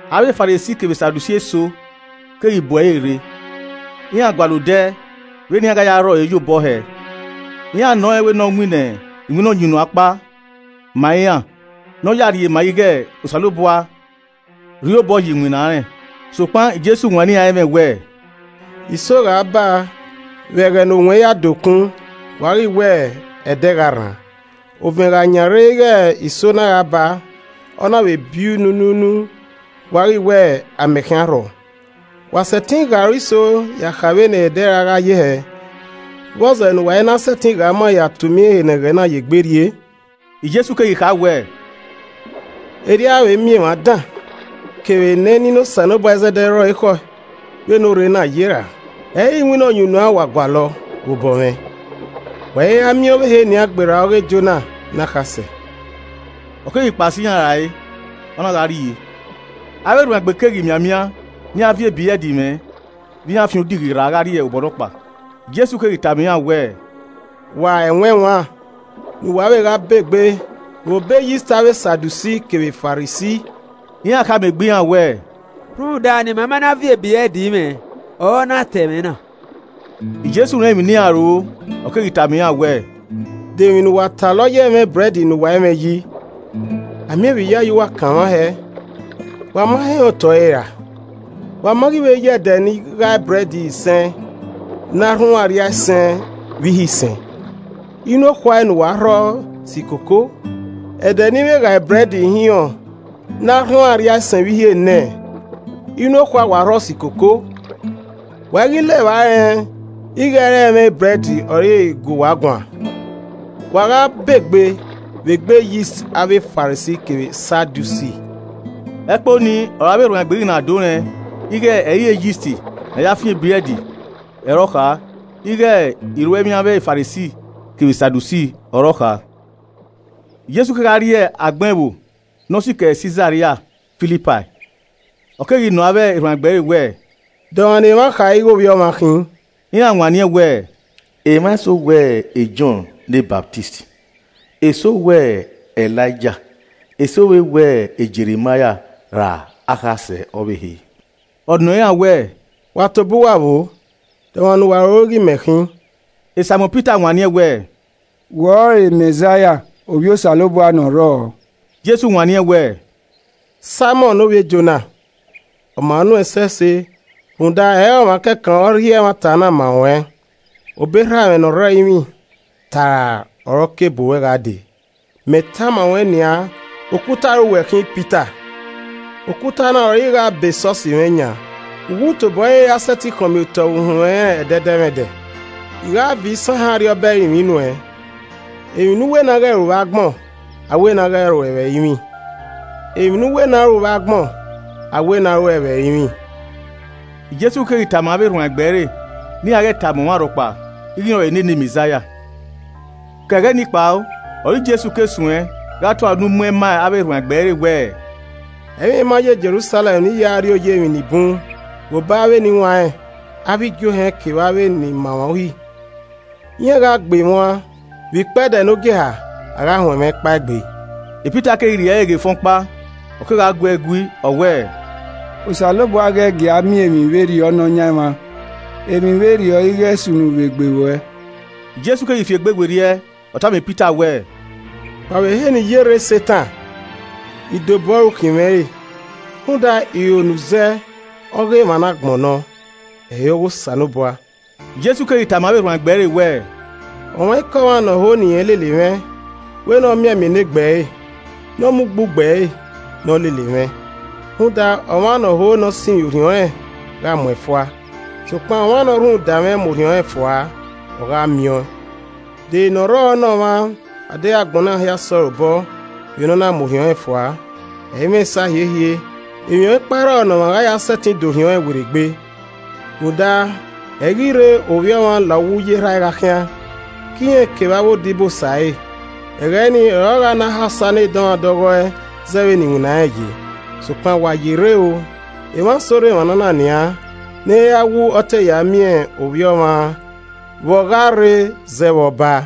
Avbe Farisi kevbe Sadusi eso keghi bu ẹre rre. Iran gualọ odẹ vbene iran gha ya rhọ ẹre ye obọ hẹẹ. Iran nọ rẹn wẹẹ ne ọ winna iwinna ọyunnuan ọkpa ma iran ne ọ ya rhie ma ighe Osanobua rhie obọ ye iwinna rẹn. Sokpan Jesu wanniẹn iran ẹmwẹ wẹẹ, “Iso gha baa vbe ẹghẹ ne owẹn ya de okun, wa ghi wẹẹ, ‘ẹdẹ gha rran.’ Ovẹn gha yan rre ighẹ iso na gha baa, ọ na vbe bi nu nu nu, wa ghi wẹẹ, ‘Amẹ khian rhọ.’ Wa sẹtin ghe aro iso ya kha vbene ẹdẹ ra gha ye hẹ, vbọzẹ ne uwa i na sẹtin ghe ama ya ta umian ehe ne ẹghẹ na ye na gbe rrie?” Jesu keghi kha wẹẹ, “Erriọ a vbe miẹn emwa dan kevbe ne ẹnina Osanobua izẹdẹ rre ọre ekhọe vbe ne orre na ye ra? Ẹ i re iwinna ọyunnuan wa gualọ vbe obọ mwẹ? Wa i ra miẹn ọvbehe nian gberra ọ ghe Jona ne akhasẹ.” Ọ keghi kpao sẹ iran rae, ọ na gha rrie. Avbe erhuanegbe keghi mianmian ne iran viọ ebrẹd mwẹ vbe iran fian odighi rra ghe obọ nọkpa. Jesu keghi tama iran wẹẹ, “Wa mwẹ ẹwaẹn, ne u wa vbe gha begbe vbe obọ eyist avbe Sadusi kevbe Farisi.” Iran khama egbe iran wẹẹ, “Rhunmwuda ne ima ma na viọ ebrẹd mwẹ ọre ọ na ta ẹmwẹ na.” Jesu rẹn emwi ne iran roro, ọ keghi tama iran wẹẹ, “De emwi ne uwa talọ ye ẹmwẹ ebrẹd ne uwa i mwẹ yi? a miẹn vbe iyayi uwa kanmwa hẹ! Wa ma he rẹn otọe ẹre ra? Wa ma ghi ye ẹdẹ ne I ghae ebrẹd isẹn ne arhunmwu arriaisẹn vbe ihe isẹn, inu okhuae ne uwa rhọ si koko? Ẹdẹ ne I vbe ghae ebrẹd ihinrọn ne arhunmwu arriaisẹn vbe ihe enẹ, inu okhuae wa rhọ si koko? Wa i ghi la evba rẹn ighe ẹ i re ẹmwẹ ebrẹd ọre I gu uwa guan? Wa gha begbe vbe egbe eyist avbe Farisi kevbe Sadusi.” Ẹkpo nii ọre avbe erhuanegbe ghi na do rẹn ighe ẹ i re eyist na ya fian ebrẹd ọre ọ kha ighe iruemwi avbe Farisi kevbe Sadusi ọre ọ kha. Jesu kegha rrie agbọn ẹvbo nọ sikẹ Sisaria Filipai, ọ keghi nọ avbe erhuanegbe ẹre wẹẹ, “De ọmwa ne emwa kha ighẹ Ovbi Ọmwa khin?” Iran wanniẹn wẹẹ, “Emwa eso wẹ Jọn ne Ọsamẹ, eso wẹ Elaija eso vbe wẹ Jeremaia ra akhasẹ ọvbehe.” Ọ nọ iran wẹẹ, “Wa tobọ uwa vboo? De omwa ne uwa roro ighe me khin?” Saimọn Pita wanniẹn wẹẹ, “Wẹ ọrọre Mẹzaia, ovbi Osanobua ne ọ rrọọ.” Jesu wanniẹn wẹẹ, “Saimọn ne ovbi Jona, ọ ma nuẹn ẹsẹse rhunmwuda ẹ i re ọmwa kẹkan ọre ọ rhie ẹmwata na ma ruẹn, obọ Erha mwẹ ne ọ rre ẹrinmwi taara ọre ọ ke bu ruẹ gha dee. Mẹ tama ruẹn nian okuta ọre uwẹ khin Pita, okuta na ọre I gha bọ esọsi mwẹ yan. Uwu tobọ ọre i ra sẹtin khọnmiotọ vbe uhunmwu ẹnrẹn ẹdẹdẹmwẹdẹ. I gha viọ isanhẹn Arriọba ẹrinmwi nuẹn, emwi ne u wẹ ne a ghẹ ru vbe agbọn, a wẹ ne a ghẹ ru ẹe vbe ẹrinmwi. Emwi ne u wẹ ne a ru vbe agbọn, a wẹ ne a ru ẹe vbe ẹrinmwi.” Jesu keghi tama avbe erhuanegbe ẹre ne iran ghẹ tama ọmwa rhọkpa ighe rẹn ọrọre ne ne Mẹzaia. Ke ẹghẹ ni kpao, ọre Jesu ke suẹn gha tua unu muẹn ma avbe erhuanegbe ẹre wẹẹ, “Ẹ i mwẹ I ma yo Jerusalẹm ne I ya rri oya emwi ni bun vbe obọ avbe eniwanrẹn, avbe igiohẹn kevbe avbe iran ni ma emwa Uhi. Iran gha gbe mwẹ uan, vbe ikpẹdẹ ne ogieha, a gha huẹn mwẹ kpaegbe.” Pita keghi rhie ẹre ghe efẹn ọkpa, ọ kegha gu ẹe gui ọ wẹẹ, “Osanobua ghẹ gia miẹn emwi vberriọ Nọyaẹnmwa, emwi vberriọ ighe sunu vbe egbe ruẹ.” Jesu keghi fiegbe werriẹ, ọ tama Pita wẹẹ, “Kpao vbe ehe ne I ye rre, Setan. Idobo ọre u khin mwẹ re, rhunmwuda iro ne u zẹ ọghe emwa ne agbọn nọ, ẹ i re ọghe Osanobua.” Jesu keghi tama avbe erhuanegbe ẹre wẹẹ, “Ọmwaikọmwa ne ọ ho ne irẹn lele mwẹ, wẹ ne ọ mianmian enegbe ẹre, ne ọ mu ugbugbe ẹre, ne ọ lele mwẹ. Rhunmwuda, ọmwa ne ọ ho ne ọ sinmwi orhiọn rẹn gha muẹn fua, sokpan ọmwa ne ọ rhunmwuda mwẹ mu orhiọn rẹn fua, ọ gha miẹn ọẹn. De ere ne ọ rrọọ ne ọmwa adeghẹ agbọn na hia sẹ ọre obọ vbene ọ na mu orhiọn rẹn fua? Ẹ i mwẹ esa hiehie. Emwi ọkpa i rrọọ ne ọmwa gha ya sẹtin dẹ orhiọn irẹn werriegbe. Rhunmwuda ẹ i ghi rrie Ovbi Ọmwa la uwu uyi Erha ẹe gha khian, ke irẹn kevbe avbe odibosa ẹre, ẹghẹ nii, ọre ọ gha na ha osa ne edọmwadẹ ọghọe zẹ vbene iwinna rẹn ye. Sokpan wa ye rre o, emwa eso rre emwa na nian, ne ẹ i ra wu ọ te ya miẹn Ovbi Ọmwa vbe ọ gha rre zẹ vbe Ọba.”